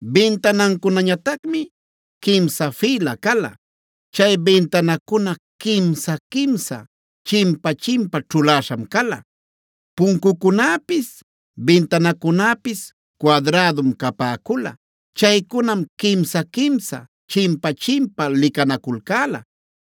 Bintanancunañatacmi quimsa fïla cala. Chay bintanacuna quimsa-quimsa, chimpa-chimpa ćhuläśham cala. Puncucunäpis, bintanacunäpis cuadrädum capäcula. Chaycunam quimsa-quimsa, chimpa-chimpa licanaculcäla.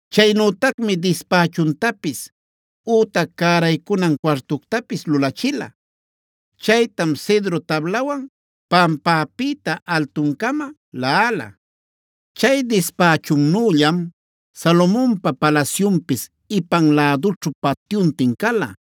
Chaynütacmi dispächuntapis ütac cäraycunan cuartuctapis lulachila. Chaytam cedro tablawan pampäpïta altuncama laꞌala. Chay dispächunnüllam Salomonpa palasyunpis ipan lädućhu patyuntin cala.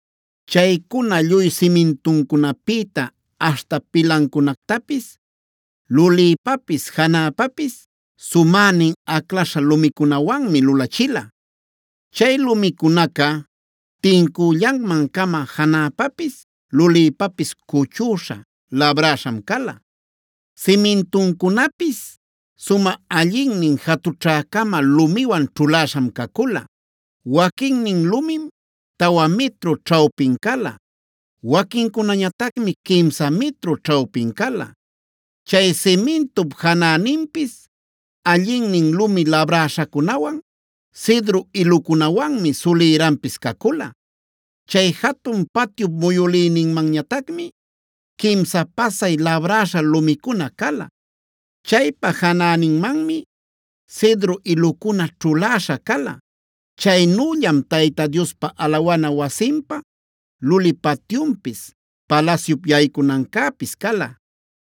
Chaycuna lluy simintuncunapïta aśhta pilancunactapis lulïpapis, janäpapis sumänin aclaśha lumicunawanmi lulachila. Chay lumicunaca tincüllanman-cama janäpapis lulïpapis cuchüśha, labräśham cala. Simintuncunapis sumä allinnin jatućhä-cama lumiwan ćhulaśham cacula. Waquinnin lumim tawa mitru ćhawpin cala. Waquincunañatacmi quimsa mitru ćhawpin cala. Chay simintup janäninpis allinnin lumi labräśhacunawan, cedro ilucunawanmi sulïranpis cacula. Chay jatun patyup muyülïninmanñatacmi quimsa pasay labräśha lumicuna cala. Chaypa janäninmanmi cedro ilucuna ćhuläśha cala. Chaynüllam Tayta Diospa alawana wasinpa luli patyunpis, palasyup yaycunancäpis cala.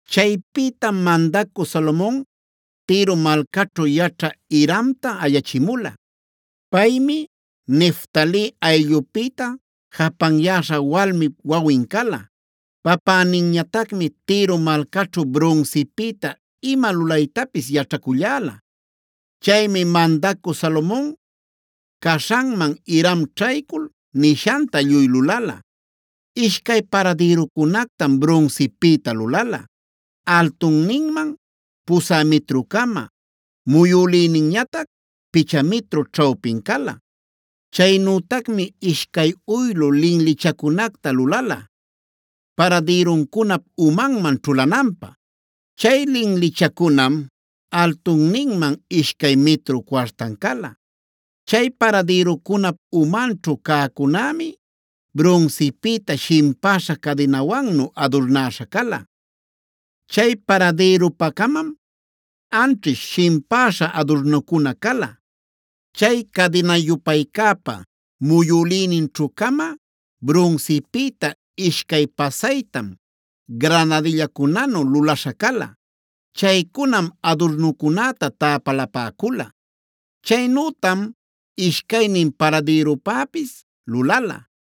Chaypïtam mandacü Salomon Tiro malcaćhu yaćhä Hiramta ayachimula. Paymi Neftali ayllupïta japanyäśha walmip wawin cala. Papäninñatacmi Tiro malcaćhu brunsipïta ima lulaytapis yaćhaculläla. Chaymi mandacü Salomon caśhanman Hiram ćhaycul nishanta lluy lulala. Ishcay paradïrucunactam brunsipïta lulala; altunninman pusä mitru-cama, muyülïninñatac picha mitru ćhawpin cala. Chaynütacmi ishcay uylu linlichacunacta lulala paradïruncunap umanman ćhulananpä. Chay linlichacunam altunninman ishcay mitru cuartan cala. Chay paradïrucunap umanćhu cäcunämi brunsipïta shimpäśha cadinawannu adurnäśha cala. Chay paradïrupa-camam anćhish shimpäśha adurnucuna cala. Chay cadina-yupaycäpa muyülïninćhü-cama brunsipïta ishcay pasaytam granadillacunanu lulaśha cala. Chaycunam adurnucunäta täpalapäcula. Chaynütam ishcaynin paradïrupäpis lulala.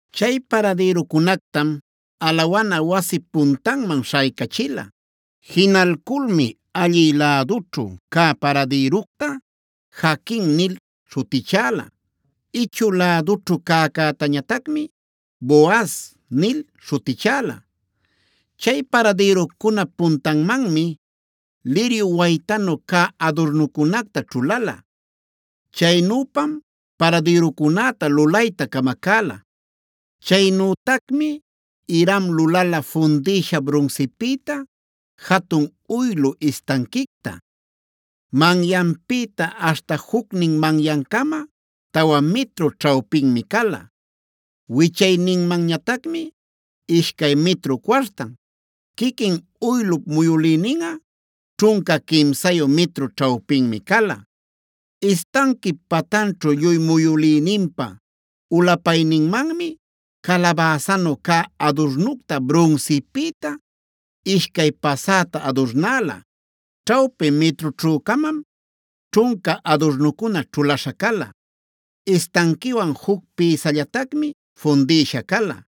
Chay paradïrucunactam alawana wasip puntanman śhaycachila. Jinalculmi allï lädućhu cä paradïructa “Jaquin” nil śhutichäla; ichü lädućhu cäcätañatacmi “Boaz” nil śhutichäla. Chay paradïrucunap puntanmanmi liryu waytanu cä adurnucunacta ćhulala. Chaynüpam paradïrucunäta lulayta camacäla. Chaynütacmi Hiram lulala fundïsha brunsipïta jatun uylu istanquicta. Manyanpïta aśhta jucnin manyancama tawa mitru ćhawpinmi cala. Wichayninmanñatacmi ishcay mitru cuartan, quiquin uylup muyülïninꞌa ćhunca quimsayu mitru ćhawpinmi cala. Istanquip patanćhu lluy muyülïninpa ulapayninmanmi calabäsanu cä adurnucta brunsipïta ishcay pasäta adurnäla. Ćhawpi mitrućhü-camam ćhunca adurnucuna ćhulaśha cala; istanquiwan juc pïsallatacmi fundïsha cala.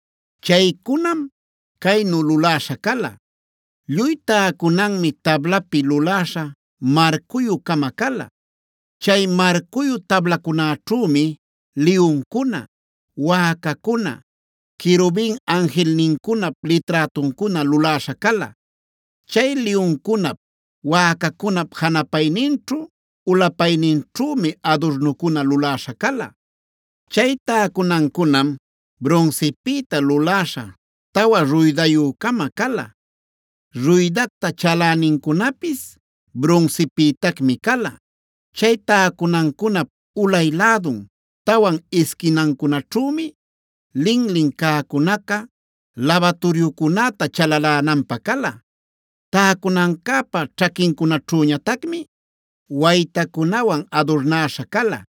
Chaycunam caynu luläśha cala: Lluy täcunanmi tablapi luläśha marcuyü-cama cala. Chay marcuyu tablacunäćhümi liyuncuna, wäcacuna, querubin anjilnincunap liträtuncuna luläśha cala. Chay liyuncunap, wäcacunap janapayninćhu ulapayninćhümi adurnucuna luläśha cala. Chay täcunancunam brunsipïta luläśha tawa ruydayü-cama cala; ruydacta chalänincunapis brunsipïtacmi cala. Chay täcunancunap ulay lädun tawan isquinancunaćhümi linlin cäcunaca labaturyucunäta chalalänanpä cala. Täcunancäpa ćhaquincunaćhüñatacmi waytacunawan adurnäśha cala.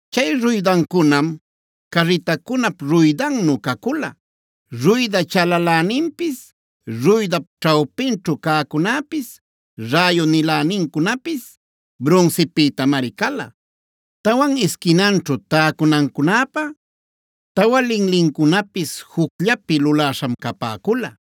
Chay ruydancunam carritacunap ruydannu cacula, ruyda chalaläninpis, ruydap ćhawpinćhu cäcunäpis, räyu-nilänincunapis brunsipïtamari cala. Tawan isquinanćhu täcunancunäpä tawa linlincunapis jucllapi luläśham capäcula.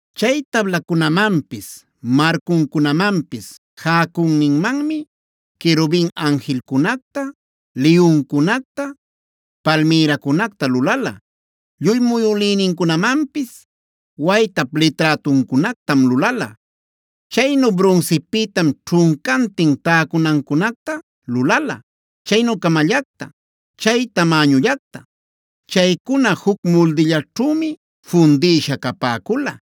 Chay tablacunamanpis marcuncunamanpis jäcüninmanmi querubin anjilcunacta, liyuncunacta, palmïracunacta lulala; lluy muyülïnincunamanpis waytap liträtuncunactam lulala. Chaynu brunsipïtam ćhuncantin täcunancunacta lulala, chaynü-camallacta, chay tamäñullacta. Chaycuna juc muldillaćhümi fundïsha capäcula.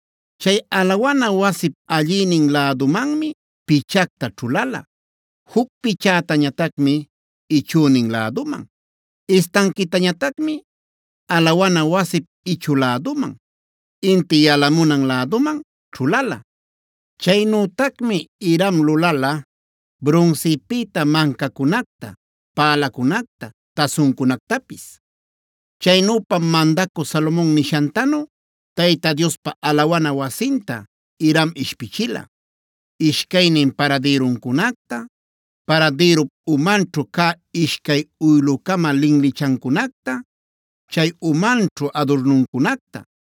Chay alawana wasip allïnin lädumanmi pichacta ćhulala, juc pichätañatacmi ichünin läduman. Istanquitañatacmi alawana wasip ichü lädun, inti yalamunan läduman ćhulala. Chaynütacmi Hiram lulala brunsipïta mancacunacta, pälacunacta, tasuncunactapis. Chaynüpam mandacü Salomon nishantanu Tayta Diospa alawana wasinta Hiram ishpichila: Ishcaynin paradïruncunacta, paradïrup umanćhu cä ishcay uylu-cama linlichancunacta, chay umanćhu adurnuncunacta,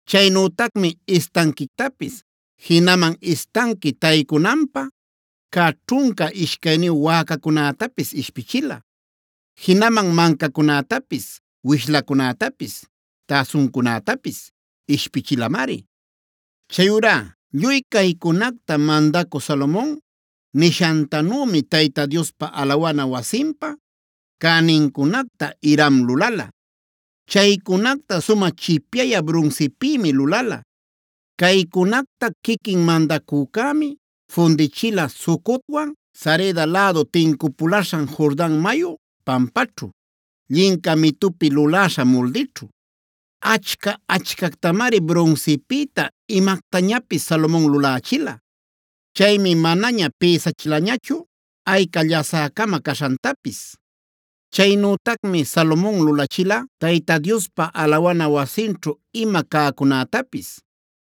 Chaynütacmi istanquictapis, jinaman istanqui taycunanpä cä ćhunca ishcayniyu wäcacunätapis ishpichila. Jinaman mancacunätapis, wishlacunätapis, tasuncunätapis ishpichilamari. Chayurá lluy caycunacta mandacü Salomon nishantanümi Tayta Diospa alawana wasinpa cänincunacta Hiram lulala. Chaycunacta sumä chipyayä brunsipïmi lulala. Caycunacta quiquin mandacücämi fundichila Sucotwan Sareda lädu tincupulaśhan Jordan mayu pampaćhu, llinca mitupi luläśha muldićhu. Achca-achcactamari brunsipïta imactañapis Salomon lulächila. Chaymi manaña pïsachilañachu ayca llasä-cama caśhantapis. Chaynütacmi Salomon lulachila Tayta Diospa alawana wasinćhu ima cäcunätapis: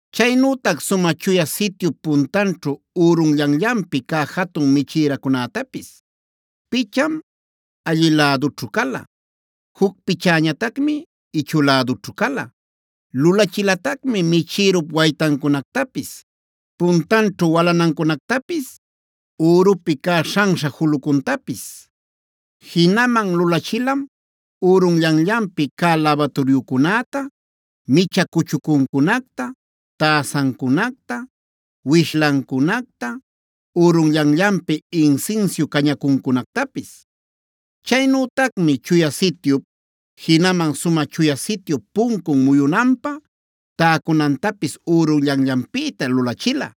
chaynütac Sumä Chuya Sityup puntanćhu ürunllanllanpi cä jatun michïracunätapis;e picham allï lädućhu cala, juc pichäñatacmi ichü lädućhu cala. Lulachilatacmi michïrup waytancunactapis, puntanćhu walanancunactapis, ürupi cä śhanśha julucuntapis. Jinaman lulachilam: ürunllanllanpi cä labaturyucunäta, micha cuchucuncunacta, täsancunacta, wishlancunacta, ürunllanllanpi insinsiu cañacuncunactapis. Chaynütacmi Chuya Sityup, jinaman Sumä Chuya Sityup puncun muyunanpä täcunantapis ürunllanllanpïta lulachila.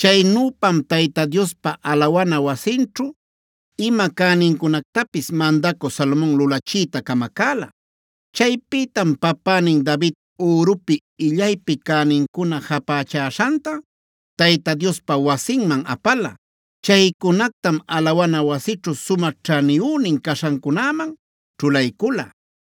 Chaynüpam Tayta Diospa alawana wasinćhu ima cänincunactapis mandacü Salomon lulachiyta camacäla. Chaypïtam papänin David ürupi illaypi cänincuna japächäśhanta Tayta Diospa wasinman apala.f Chaycunactam alawana wasićhu sumä ćhaniyünin caśhancunäman ćhulaycula.